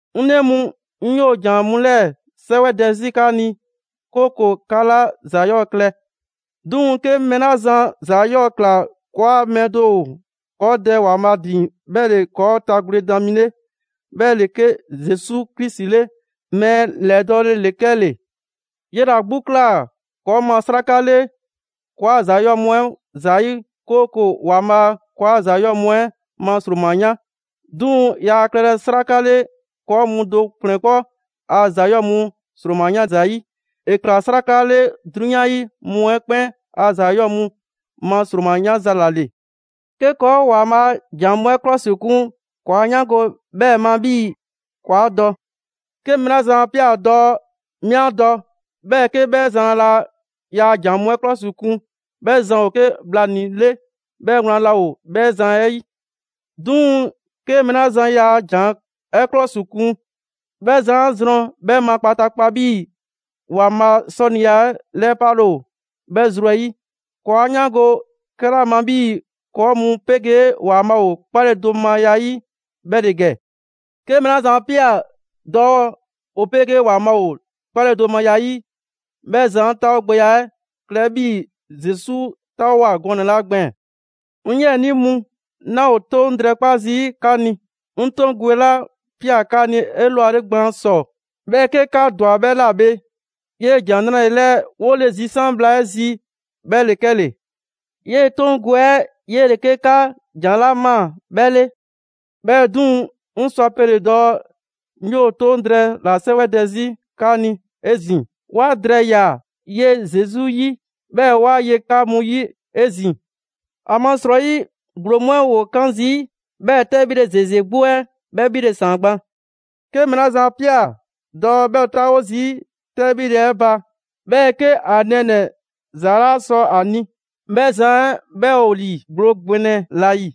'Ŋ 'nɛ mu, 'ŋ 'yoo‑ ‑jan mu 'lɛɛ‑ 'sɛwɛdɛ 'zi 'ka ni, 'kooko‑ 'ka 'laa ‑za 'yɔɔ‑ klɛ. 'Duŋ‑, 'ke mɛɛ 'la zan ‑za 'yɔɔ‑ ꞊kla, ‑kɔɔa' mɛɛ do ‑o ‑kɔɔ' Dɛ ‑Waanbhaa' ‑din 'bhɛ ‑le ‑kɔɔ' tagwledan mi 'le, 'bhɛ ‑le 'ke Zesu Krisi 'le, mɛɛ ‑lɛdɔɔle ‑le 'kɛle‑. 'Yele‑ 'a 'gbu ꞊kla ‑kɔɔ' ma 'sraka 'le ‑kɔɔa' ‑za 'yɔɔ‑ mu 'ɛ ‑zayi', 'kooko‑ ‑Waanbhaa' ‑kɔɔa' ‑za 'yɔɔ‑ mu 'ɛ ma ‑sroma yan. 'Duŋ‑ yaa klɛlɛ 'sraka 'le ‑kɔɔ' mu do ‑kplɛn 'kpɔ a ‑za 'yɔɔ‑ mu ‑sroma 'yan zayi', ‑e ꞊kla 'sraka 'le 'drunyan 'yi mu 'ɛ 'kpɛn a ‑za 'yɔɔ‑ mu ma ‑sroma 'yanza‑ ‑la ‑le. 'Ke ‑kɔɔ' ‑Waanbhaa' a ‑jan mu 'ɛ 'klɔsikun, ‑kɔɔ' 'a 'yaango‑ bhɛɛ‑ ma 'bhii‑ ‑kɔɔ 'a dɔ. 'Ke mɛɛ 'la zan 'a ꞊pia dɔɔ: «'Mi 'a dɔ», 'Bhɛɛ‑ 'ke 'bhɛ zan laa ‑yaa' ‑jan mu 'ɛ 'klɔsikun, 'bhɛ zan ‑o 'ke bhlanii‑ 'le, 'bhɛɛ‑ wlan laa ‑o 'bhɛ zan 'ɛ 'yi. 'Duŋ‑, 'ke mɛɛ 'la zan ‑yaa' ‑jan 'ɛ 'klɔsikun, 'bhɛ zan 'a zrɔn 'bhɛ ma kpataakpa 'bhii‑ ‑Waanbhaa' 'sɔniya 'ɛ 'lɛpale ‑o 'bhɛ zru 'ɛ 'yi. ‑Kɔɔ' 'a 'yaango‑ 'kɛla ma 'bhii‑ ‑kɔɔ' mu 'pegee ‑Waanbhaa' ‑o 'kpaledomaya 'yi, 'bhɛ ‑le ‑gɛ: 'Ke mɛɛ 'la zan 'a ꞊pia dɔɔ ‑o 'pegee ‑Waanbhaa' ‑o 'kpaledomaya 'yi, 'bhɛ zan 'taawogbɛya 'ɛ klɛ 'bhii‑ Zesu 'taawoa꞊ gɔnɛ‑ 'la gbɛɛn‑. 'Ŋ 'yiɛnii mu, 'naa ‑o 'toŋ drɛɛ 'kpa zii' 'ka ni. 'Ŋ 'toŋ gwe 'la ꞊pia 'ka ni 'elwale gban ‑sɔ 'bhɛɛ‑ 'ke 'ka ‑dwa 'bhɛ ‑la bhe 'yee‑ ‑Jan 'Nrale‑ 'lɛɛ‑ 'wole‑ zisan' bhla 'ɛ zi, 'bhɛ ‑le 'kɛle‑. 'Yee‑ 'toŋ gwe 'ɛ 'yele‑ 'ke 'ka ‑jan 'la ꞊maa 'bhɛ 'le. 'Bhɛɛ‑ 'duŋ‑, 'ŋ sɔ ‑a pele‑ dɔɔ 'ŋ 'yoo‑ 'toŋ drɛɛ ‑la 'sɛwɛdɛ 'zi 'ka ni 'ezin‑; ‑wa drɛɛya 'ɛ ye Zesu 'yi, 'bhɛɛ‑ ‑wa ye 'ka mu 'yi 'ezin‑. ‑Amasrɔyi, ‑gblo mu 'ɛ ‑woo 'kan zii', 'bhɛɛ‑ 'tɛbhile ‑zeze 'gbu 'ɛ 'bhɛ 'bhile‑ ‑saan gban. 'Ke mɛɛ 'la zan 'a ꞊pia dɔɔ 'bhɛ ‑o 'taawo zii' 'tɛbhile 'ɛ ba, 'bhɛɛ‑ 'ke ‑a nɛɛnɛ‑ ‑za 'laa sɔ ‑a ni, 'bhɛ zan 'ɛ 'bhɛ ‑o ‑li ‑gblo ‑gbɛnɛ ‑la ‑yi.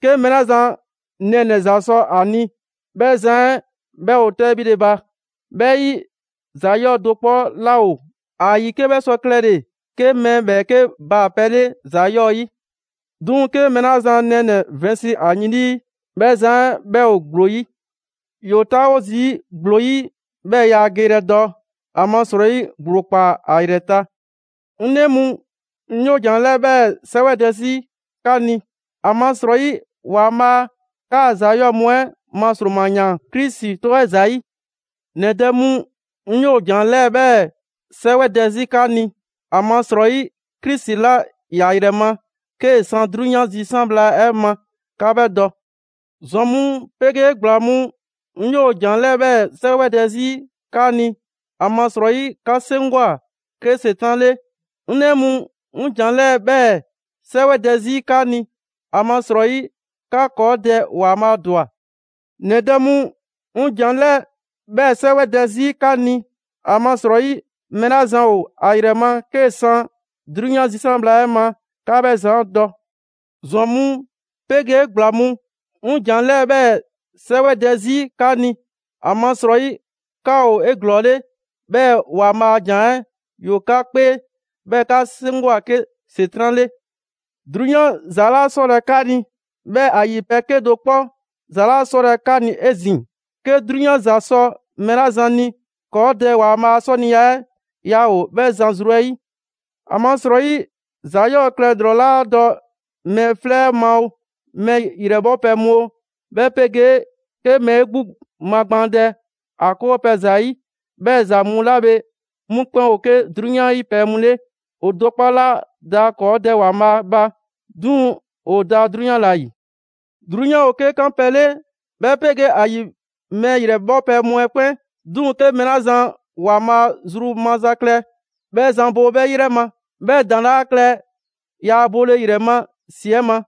'Ke mɛɛ 'la zan nɛɛnɛ‑ ‑za sɔ ‑a ni, 'bhɛ zan 'ɛ 'bhɛ ‑o 'tɛbhile 'ɛ ba. 'Bhɛ 'yi, ‑za 'yɔɔ‑ do 'kpɔ 'laa ‑o ‑a ‑yi 'ke 'bhɛ sɔ klɛle‑ 'ke mɛɛ ‑bhɛɛke' baa‑ pɛ 'le ‑za 'yɔɔ‑ 'yi. 'Duŋ‑, 'ke mɛɛ 'la zan nɛɛnɛ‑ vɛnsi ‑a yin 'lii, 'bhɛ zan 'ɛ 'bhɛ ‑o ‑gblo 'yi. ‑Yoo 'taawo zii' ‑gblo 'yi; 'bhɛɛ‑ yaa ‑a geyrɛ dɔ, ‑amasrɔyi ‑gblo ‑kpaa ‑a ‑yrɛ ta. 'Ŋ 'nɛ mu, 'ŋ 'yoo‑ ‑jan 'lɛɛ‑ 'bhɛɛ‑ 'sɛwɛdɛ 'zi 'ka ni, ‑amasrɔyi ‑Waanbhaa' 'kaa‑ ‑za 'yɔɔ‑ mu 'ɛ ma ‑sroma ‑yaan Krisi 'tɔ 'ɛ ‑zayi'. ‑Nɛ dɛ mu, 'ŋ 'yoo‑ ‑jan 'lɛɛ‑ 'bhɛɛ‑ 'sɛwɛdɛ 'zi 'ka ni, ‑amasrɔyi Krisi 'la ‑ya ‑yrɛ ma 'kee‑ san 'drunyan zisan' bhla 'ɛ ma, 'ka 'bhɛ dɔ. ‑Zwan mu 'pegee ‑gbla mu, 'ŋ 'yoo‑ ‑jan 'lɛɛ‑ 'bhɛɛ‑ 'sɛwɛdɛ 'zi 'ka ni, ‑amasrɔyi 'ka 'seŋgwa‑ 'ke ‑Setran' 'le. 'Ŋ 'nɛ mu, 'ŋ ‑jan 'lɛɛ‑ 'bhɛɛ‑ 'sɛwɛdɛ 'zi 'ka ni, ‑amasrɔyi 'ka ‑kɔɔ' Dɛ ‑Waanbhaa' ‑dwa. ‑Nɛ dɛ mu, 'ŋ ‑jan 'lɛɛ‑ 'bhɛɛ‑ 'sɛwɛdɛ 'zi 'ka ni, ‑amasrɔyi mɛɛ 'la zan ‑o ‑a ‑yrɛ ma 'kee‑ san 'drunyan zisan' bhla 'ɛ ma, 'ka 'bhɛ zan 'ɛ dɔ. ‑Zwan mu 'pegee ‑gbla mu, 'ŋ ‑jan 'lɛɛ‑ 'bhɛɛ‑ 'sɛwɛdɛ 'zi 'ka ni, ‑amasrɔyi 'ka ‑o 'eglɔɔle 'bhɛɛ‑ ‑Waanbhaa' a ‑jan 'ɛ ‑yoo 'ka 'kpee, 'bhɛɛ‑ 'ka 'seŋgwa‑ 'ke ‑Setran' 'le. 'Drunyan ‑za 'laa 'sɔlɛ‑ 'ka ni, 'bhɛɛ‑ ‑a ‑yi pɛ 'kedo‑ 'kpɔ ‑za 'laa 'sɔlɛ‑ 'ka ni 'ezin‑. 'Ke 'drunyan ‑za sɔ mɛɛ 'la zan ni, ‑kɔɔ' Dɛ ‑Waanbhaa' a 'sɔniya 'ɛ yaa ‑o 'bhɛ zan zru 'ɛ 'yi. ‑Amasrɔyi, ‑za 'yɔɔ‑ klɛ ‑lrɔ 'la dɔ mɛɛ 'flɛ 'ɛ ma oo, mɛɛ ‑yrɛ 'bhɔpɛ‑ mu oo, 'bhɛ 'pegee 'ke mɛɛ 'e 'gbu magbaandɛ ‑a 'kɔɔpɛ‑ ‑zayi', 'bhɛ ‑za mu 'la bhe, 'mu 'kpɛn ‑o 'ke 'drunyan 'yi pɛ mu 'le. ‑O do 'kpɔ 'laa da ‑kɔɔ' Dɛ ‑Waanbhaa' ba, 'duŋ‑ ‑o da 'drunyan ‑la ‑yi. 'Drunyan ‑o 'ke 'kanpɛ‑ 'le, 'bhɛ 'pegee ‑a ‑yi mɛɛ ‑yrɛ 'bhɔpɛ‑ mu 'ɛ 'kpɛn. 'Duŋ‑ 'ke mɛɛ 'la zan ‑Waanbhaa' zru maza klɛ, 'bhɛ zan bo 'bhɛ 'yrɛ ma, 'bhɛɛ‑ ‑daŋ' 'laa klɛ ‑yaa' bole ‑yrɛ ma ‑si 'ɛ ma.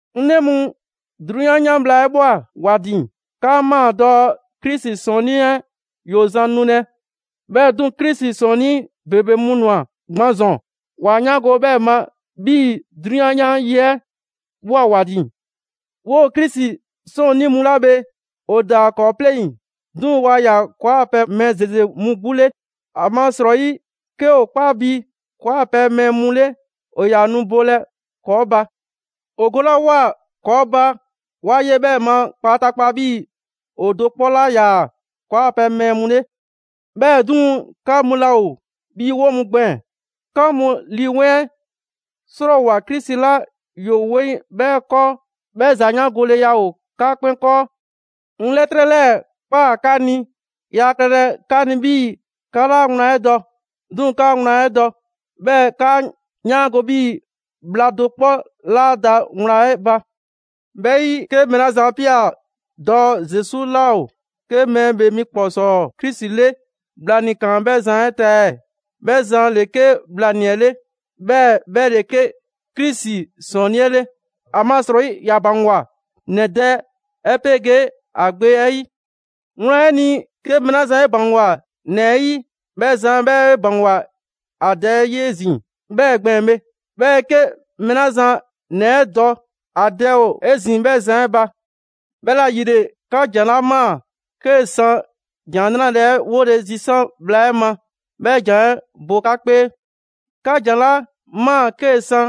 'Ŋ 'nɛ mu, 'drunyan 'yan bhla 'ɛ ꞊bhwa ‑wa ‑din! 'Kaa ꞊maa dɔɔ Krisi 'Sɔɔnnii 'ɛ ‑yoo zan nulɛ; 'bhɛɛ‑ 'duŋ‑, Krisi 'sɔɔnnii ‑bebe mu ‑nwa gban ‑zɔn, 'wa 'yaango‑ 'bhɛɛ‑ ma 'bhii‑ 'drunyan 'yan yi 'ɛ ꞊bhwa ‑wa ‑din. 'Woo‑ Krisi 'sɔɔnnii mu 'la bhe, ‑o ‑daa ‑kɔɔ' 'pleŋ, 'duŋ‑ waa ‑yaa ‑kɔɔ' a pɛ mɛɛ ‑zeze mu 'gbu 'le. ‑Amasrɔyi, 'ke ‑o 'kpa bi ‑kɔɔ' a pɛ mɛɛ mu 'le, ‑o ‑yaa nu bolɛ ‑kɔɔ' ba. ‑O golawoa ‑kɔɔ' ba, ‑wa ye 'bhɛɛ‑ ma kpataakpa 'bhii‑ ‑o do 'kpɔ 'laa ‑yaa ‑kɔɔ' 'a pɛ mɛɛ mu 'le. 'Bhɛɛ‑ 'duŋ‑, 'ka mu laa ‑o 'bhii‑ 'woo‑ mu gbɛɛn‑. 'Ka mu Lii 'Weŋ 'ɛ 'srɔɔwoa‑ Krisi 'la ‑yoo 'weŋ 'bhɛ 'kɔɔ. 'Bhɛɛ‑ ‑zayaangoleya ‑o 'ka 'kpɛn 'kɔɔ. 'Ŋ 'lɛtrɛ 'lɛɛ‑ ꞊kpaa 'ka ni, yaa klɛlɛ 'ka ni 'bhii‑ 'ka 'laa wlan 'ɛ dɔ; 'duŋ‑ 'ka wlan 'ɛ dɔ, 'bhɛɛ‑ 'kaa 'yaango‑ 'bhii‑ bhla do 'kpɔ 'laa da wlan 'ɛ ba. 'Bhɛ 'yi, 'ke mɛɛ 'la zan 'a ꞊pia dɔɔ Zesu 'laa ‑o 'ke Mɛɛ ‑Bhee mi ‑kpɔsɔɔ Krisi 'le, bhlanii‑ ‑kaan 'bhɛ zan 'ɛ ta ɛɛ? 'Bhɛ zan ‑le 'ke bhlanii‑ 'ɛ 'le, 'bhɛɛ‑ 'bhɛ ‑le 'ke Krisi ‑Sɔɔnnii' 'ɛ 'le. ‑Amasrɔyi, ‑ya ‑baŋgwa ‑Nɛ Dɛ 'ɛ 'pegee ‑a Gbe 'ɛ 'yi. Wlan 'ɛ ni, 'ke mɛɛ 'la zan 'e ‑baŋgwa ‑Nɛ 'ɛ 'yi, 'bhɛ zan 'ɛ 'bhɛ 'e ‑baŋgwa ‑a Dɛ 'yi 'ezin‑ 'bhɛɛ‑ gbɛɛn‑ bhe. 'Bhɛɛ‑ 'ke mɛɛ 'la zan ‑Nɛ 'ɛ dɔ, ‑a Dɛ ‑o 'ezin‑ 'bhɛ zan 'ɛ ba. 'Bhɛla‑ ‑yile, 'ka ‑jan 'la ꞊maa 'kee‑ san ‑Jan 'Nrale‑ 'ɛ 'wole zisan bhla 'ɛ ma, 'bhɛ ‑jan 'ɛ bo 'ka 'kpee. 'Ka ‑jan 'la ꞊maa 'kee‑ san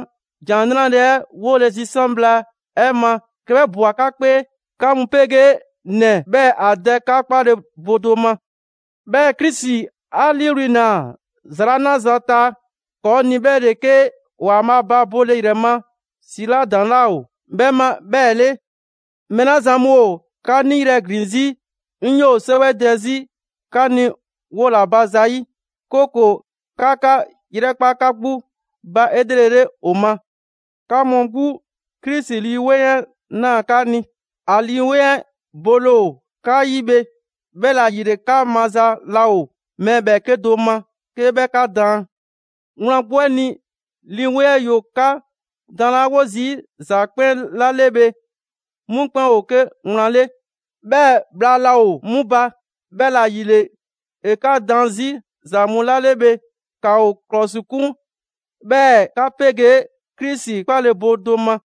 ‑Jan 'Nrale‑ 'ɛ 'wole‑ zisan' bhla 'ɛ ma, 'ke 'bhɛ ꞊bwa 'ka 'kpee, 'ka mu 'pegee ‑Nɛ 'bhɛɛ‑ ‑a Dɛ 'ka 'kpale‑ bo do ma. 'Bhɛɛ‑ Krisi 'a 'liiwli‑ ‑naa ‑za 'la 'naza‑ ta ‑kɔɔ' ni 'bhɛ ‑le 'ke ‑Waanbhaa' ba bole ‑yrɛ ma ‑si 'la ‑daŋ' 'laa ‑o 'bhɛ ma 'bhɛɛ‑ 'le. Mɛɛ 'la zan mu ‑o 'ka 'niyrɛ‑ ‑glin 'zi, 'ŋ 'yoo‑ 'sɛwɛdɛ 'zi 'ka ni 'wola‑ ba zayi'; 'kooko‑ 'ka 'ka 'yrɛkpa 'ka 'gbu ba 'elrele ‑o ma. 'Ka mu 'gbu, Krisi Lii 'Weŋ 'ɛ ꞊naa 'ka ni. ‑A Lii 'Weŋ 'ɛ bole ‑o 'ka 'yi bhe, 'bhɛla‑ ‑yile 'ka maza laa ‑o mɛɛ ‑bhɛɛke' do ma 'ke 'bhɛ 'ka daan. Wlan 'gbu 'ɛ ni, Lii 'Weŋ 'ɛ ‑yoo 'ka daanlawo zii' ‑za 'kpɛn 'la 'le bhe 'mu 'kpɛn ‑o 'ke wlan 'le, 'bhɛɛ‑ bhla laa ‑o 'mu ba. 'Bhɛla‑ ‑yile, ‑e 'ka daan 'zi ‑za mu 'la 'le bhe, ‑kaa ‑o ‑klɔsikun, 'bhɛɛ‑ 'ka 'pegee Krisi 'kpale‑ bo do ma.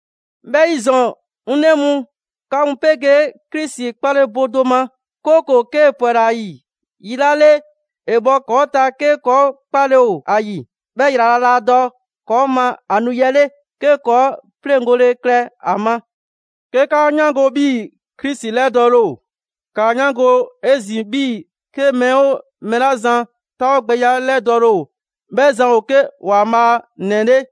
'Bhɛ 'yi ‑zɔn, 'ŋ 'nɛ mu, 'ka mu 'pegee Krisi 'kpale‑ bo do ma; 'kooko‑ 'kee‑ ‑pwɛla ‑a ‑yi yi 'la 'le, ‑e bhɔ ‑kɔɔ' ta 'ke ‑kɔɔ' 'kpale‑ ‑o ‑a ‑yi. 'Bhɛɛ‑ ‑yrala' laa dɔ ‑kɔɔ' ma ‑a nu 'yi 'ɛ 'le, 'ke ‑kɔɔ' 'pleŋgole klɛ ‑a ma. 'Ke 'kaa 'yaango‑ 'bhii‑ Krisi 'lɛdɔɔle ‑o, ‑kaa 'yaango‑ 'ezin‑ 'bhii‑ 'ke mɛɛ 'oo mɛɛ 'la zan 'taawogbɛya ‑lɛdɔɔle ‑o 'bhɛ zan ‑o 'ke ‑Waanbhaa' ‑nɛ 'le.